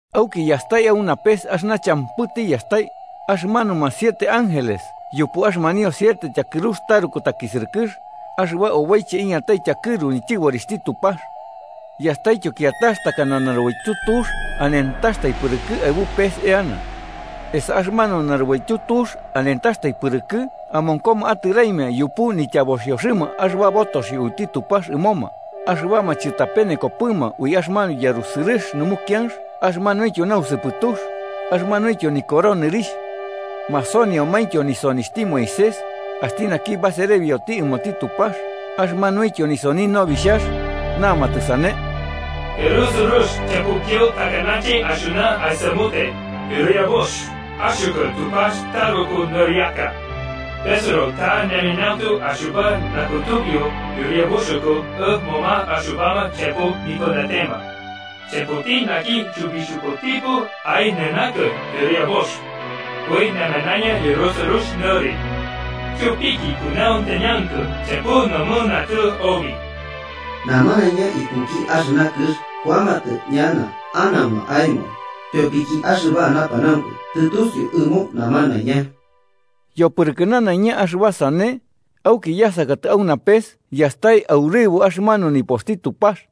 Auki yastai au napes axɨna champɨ tiyastai: axɨmanuma siete ángeles yupu axɨmanio siete tyakɨrux taruku takisɨrɨkɨx, axɨba oboiche iñatai tyakɨru nityɨborixhti Tupax. Yastaityo kiatax takana narubaityu tux anentaxtai pɨrɨkɨ aɨbu pes eana. Esa axɨmanu narubaityu tux anentaxtai pɨrɨkɨ amonkoma atɨraimia, yupu nityaboxioxɨma axɨba botoxio uiti Tupax ɨmoma, axɨbama chɨtapenekopɨma ui axɨmanu yarusɨrɨx numukianx axɨmanuintyo nausɨpɨtux, axɨmanuintyo nikoro nɨrixh. Masoniomaintyo nisonixhti Moisés, axti naki baserebioti ɨmoti Tupax, axɨmanuintyo nisoni Nobixhax. Namatɨ sane: “Yarusɨrɨx champɨityo takanache axɨna aisamute, Yɨriabux, axɨkɨ Tupax taruku nɨriaka. Besɨro ta ñemanauntu axɨba nakutubiu, Yɨriabuxɨkɨ ɨmoma axɨbama champɨ nipɨnatema. Champɨti naki chɨbixhubutipɨ aɨnanakɨ, Yɨriabux. Ui namanaiña yarusɨrɨx nɨri. Tyopiki kunauntañankɨ champɨ nomɨnantɨ obi. Namanaiña ikuki axɨna kɨx kuamatɨ ñana anauma aemo, tyopiki axɨba napanaunku tɨtusiu ɨmo namanaiña.” Yopɨrɨkɨ nanaiña axɨba sane, auki yasakatɨ au napes yastai aurɨbo axɨmanu nipoxti Tupax.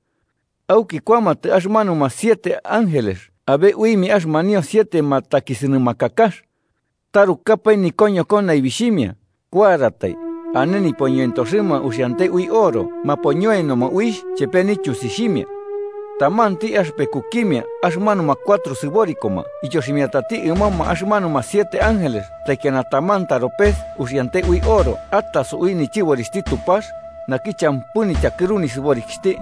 Auki kuamatɨ axɨmanuma siete ángeles abe uimia axɨmanio siete matakisɨnɨmakakax. Tarukapae nikoñoko naibixhimia, kuaratai, ane nipoñoentoxɨma uxiante ui oro mapoñoenoma uixh chepe nityusixhimia. Tamanti axɨpekukimia axɨmanuma cuatro sɨborikoma ityoximiatati ɨmoma axɨmanuma siete ángeles taikiana taman taropes uxiante ui oro ataso ui nityɨborixhti Tupax, naki champɨ nityakɨru nisɨborikixhti.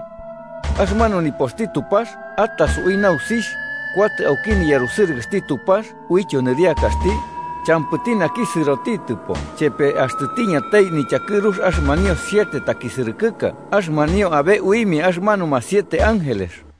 Axɨmanu nipoxti Tupax ataso ui nausixh, kuatɨ auki niyarusɨrɨkɨxti Tupax uityo nɨriakaxti, champɨti naki sɨrotitɨpo chepe axtɨ tiñatai nityakɨrux axɨmanio siete takisɨrɨkɨka axɨmanio abe uimia axɨmanuma siete ángeles.